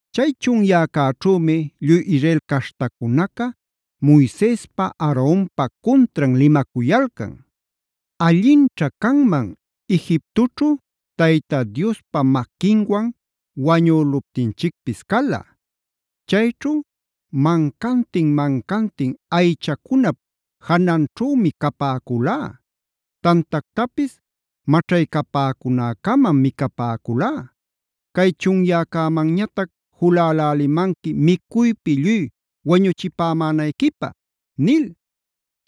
Chay chunyäcäćhümi lluy Israel caśhtacunaca Moisespa Aaronpa cuntran limacuyalcan: “Allinćha canman Egiptoćhu Tayta Diospa maquinwan wañüluptinchicpis cala. Chayćhu mancantin-mancantin aychacunap jananćhümi capäculá; tantactapis maćhaycäpäcunäcamam micapäculá. Cay chunyäcämanñatac julälälimanqui micuypi lluy wañuchipämänayquipä” nil.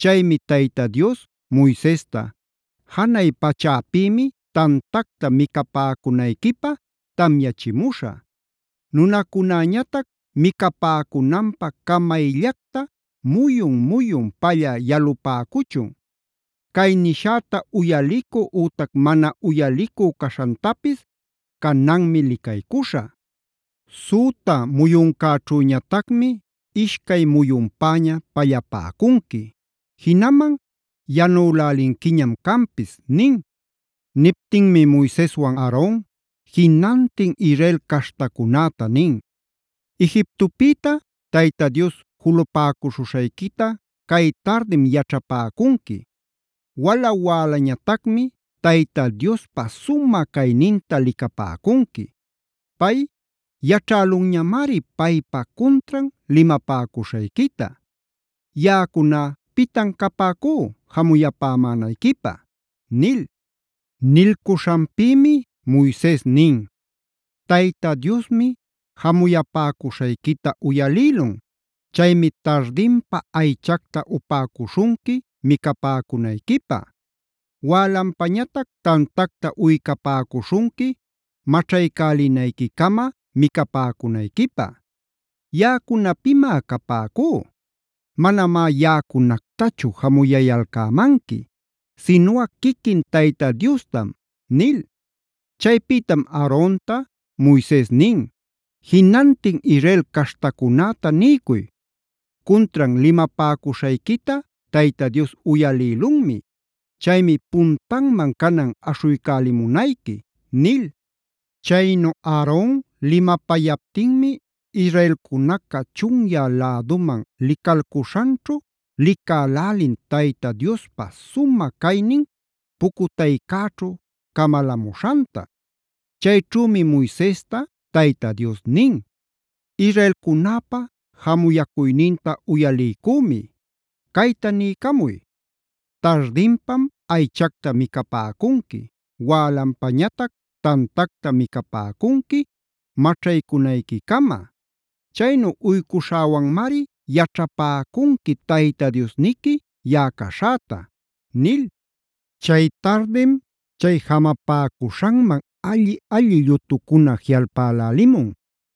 Chaymi Tayta Dios Moisesta: “Janay pachäpïmi tantacta micapäcunayquipä tamyachimuśhä.a Nunacunäñatac micapäcunanpä camayllacta muyun-muyun pallä yalupäcuchun. Cay nishäta uyalicü ütac mana uyalicü caśhantapis cananmi licaycuśhä. Süta muyuncäćhüñatacmi ishcay muyunpäña pallapäcunqui; jinaman yanülälinquiñam canpis” nin. Niptinmi Moiseswan Aaron jinantin Israel caśhtacunäta nin: “Egiptopïta Tayta Dios julupäcuśhuśhayquita cay tardim yaćhapäcunqui. Wala-wälañatacmi Tayta Diospa sumä cayninta licapäcunqui. Pay yaćhälunñamari paypa cuntran limapäcuśhayquita. ¿Yaꞌacuná pitan capäcú jamuyapämänayquipä?” nil. Nilcuśhanpïmi Moises nin: “Tayta Diosmi jamuyapäcuśhayquita uyalïlun. Chaymi tardinpa aychacta upäcuśhunqui micapäcunayquipä. Wälanpañatac tantacta uycapäcuśhunqui maćhaycälinayquicama micapäcunayquipä. ¿Yaꞌacuna pimá capäcú? Manamá yaꞌacunactachu jamuyayalcämanqui sinuꞌa quiquin Tayta Diostam” nil. Chaypïtam Aaronta Moises nin: “Jinantin Israel caśhtacunäta niycuy: ‘Cuntran limapäcuśhayquita Tayta Dios uyalïlunmi. Chaymi puntanman canan aśhuycälimunayqui’” nil. Chaynu Aaron limapayaptinmi israelcunaca chunyä läduman licalcuśhanćhu licälälin Tayta Diospa sumä caynin pucutaycäćhu camalamuśhanta. Chayćhümi Moisesta Tayta Dios nin: “Israelcunäpa jamuyacuyninta uyaliycümi. Cayta niycamuy: ‘Tardinpam aychacta micapäcunqui, wälanpañatac tantacta micapäcunqui maćhaycunayquicama. Chaynu uycuśhäwanmari yaćhapäcunqui Tayta Diosniqui yaꞌa caśhäta’” nil. Chay tardim chay jamapäcuśhanman alli-alli llutucuna jiꞌalpälälimun.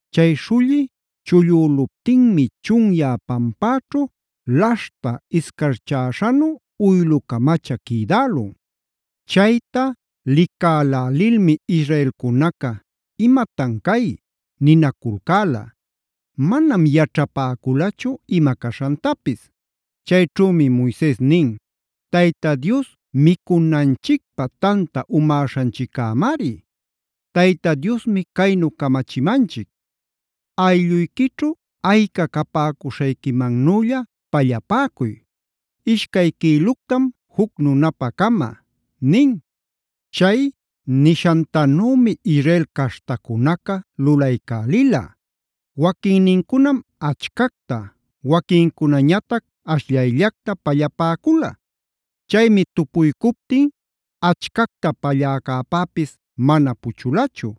Chay śhulli chullüluptinmi chunyä pampäćhu laśhta iscarchäśhanu uylu-camacha quïdälun. Chayta licalälilmi israelcunaca: “¿Imatan cay?”c ninaculcäla. Manam yaćhapäculachu ima caśhantapis.d Chayćhümi Moises nin: “Tayta Dios micunanchicpä tanta umäśhanchiccämari. Tayta Diosmi caynu camachimanchic: aylluyquićhu ayca capäcuśhayquimannülla pallapäcuy; ishcay quïluctam juc nunapa-cama” nin. Chay nishantanümi Israel caśhtacunaca lulaycälila. Waquinnincunam achcacta, waquincunañatac ashllayllacta pallapäcula. Chaymi tupuycuptin achcacta palläcäpäpis mana puchulachu;e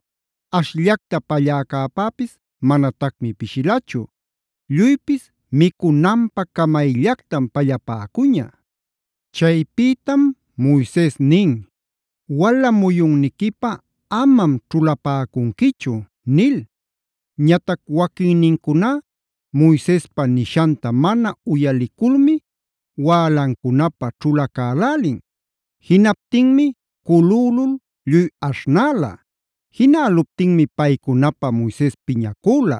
ashllacta palläcäpäpis manatacmi pishilachu. Lluypis micunanpä camayllactam pallapäcuña. Chaypïtam Moises nin: “Wala muyunniquipä amam ćhulapäcunquichu” nil. Ñatac waquinnincuná Moisespa nishanta mana uyaliculmi wälancunapä ćhulacälälin. Jinaptinmi culülul lluy aśhnäla. Jinäluptinmi paycunapä Moises piñacüla.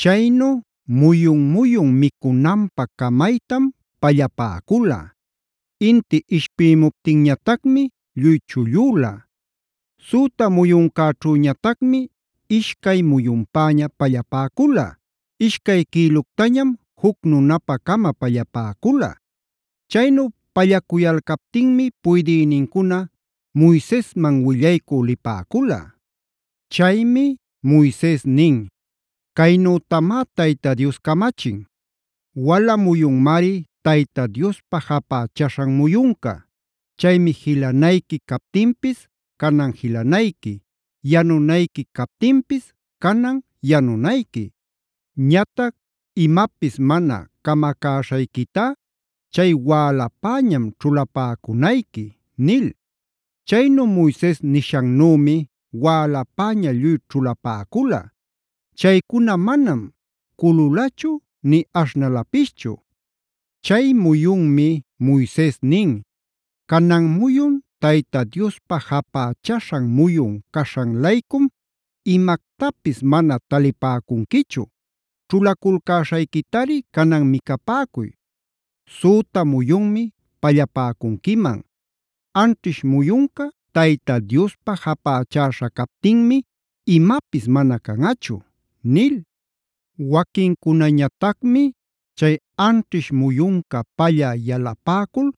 Chaynu muyun-muyun micunanpä camaytam pallapäcula. Inti ishpïmuptinñatacmi lluy chullüla. Süta muyuncäćhüñatacmi ishcay muyunpäña pallapäcula; ishcay quïluctañam juc nunapa-cama pallapäcula. Chaynu pallacuyalcaptinmi puydïnincuna Moisesman willaycü lipäcula. Chaymi Moises nin: “Caynütamá Tayta Dios camachin. Wala muyunmari Tayta Diospa japächaśhan muyunca.f Chaymi jilanayqui captinpis canan jilanayqui, yanunayqui captinpis canan yanunayqui. Ñatac imapis mana camacäśhayquitá chay wälapäñam ćhulapäcunayqui” nil. Chaynu Moises nishannümi wälapäña lluy ćhulapäcula. Chaycuna manam cululachu nï aśhnalapischu. Chay muyunmi Moises nin: “Canan muyun Tayta Diospa japächäśhan muyun caśhan-laycum imactapis mana talipäcunquichu. Ćhulaculcäśhayquitari canan micapäcuy. Süta muyunmi pallapäcunquiman. Anćhish muyunca Tayta Diospa japächäśha captinmi imapis mana canꞌachu” nil. Waquinnincunañatacmi chay anćhish muyunca pallä yalapäcul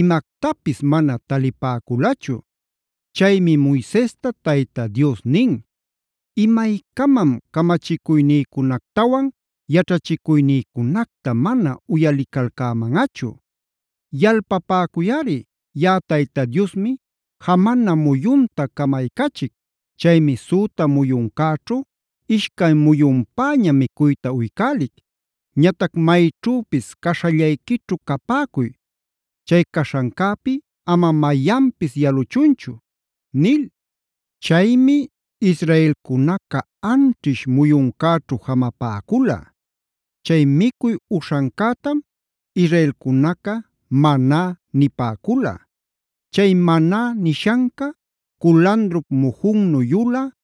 imactapis mana talipäculachu. Chaymi Moisesta Tayta Dios nin: “¿Imaycamam camachicuynïcunactawan yaćhachicuynïcunacta mana uyalicalcämanꞌachu? Yalpapäcuyꞌari, yaꞌa Tayta Diosmi jamana muyunta camaycachic. Chaymi süta muyuncäćhu ishcay muyunpäña micuyta uycälic. Ñatac mayćhüpis caśhallayquićhu capäcuy; chay caśhancäpi ama mayanpis yaluchunchu” nil. Chaymi israelcunaca anćhish muyuncäćhu jamapäcula. Chay micuy uśhancätam israelcunaca “Maná” nipäcula. Chay Maná nishanca culandrup mujunnu yulä,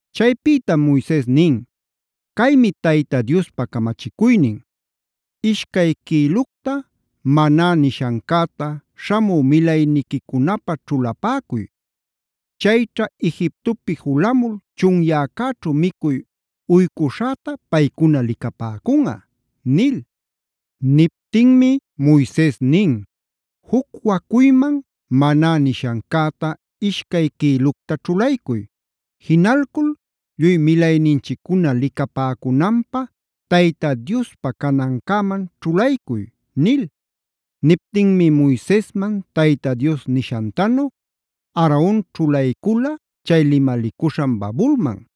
Chaypïtam Moises nin: “Caymi Tayta Diospa camachicuynin: Ishcay quïlucta ‘Maná’ nishancäta śhamü milayniquicunapä ćhulapäcuy. Chayćha Egiptopi julamul chunyäcäćhu micuy uycuśhäta paycuna licapäcunꞌa” nil. Niptinmi Moises nin: “Juc wacuyman ‘Maná’h nishancäta ishcay quïlucta ćhulaycuy. Jinalcul lluy milayninchiccuna licapäcunanpä Tayta Diospa canancäman ćhulaycuy” nil. Niptinmi Moisesman Tayta Dios nishantanu Aaron ćhulaycula chay limalicuśhan babulman.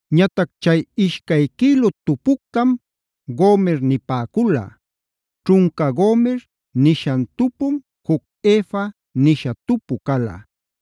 Ñatac chay ishcay quïlu tupuctam “gomer” nipäcula. Ćhunca “gomer” nishan tupum juc “Efa”j nisha tupu cala.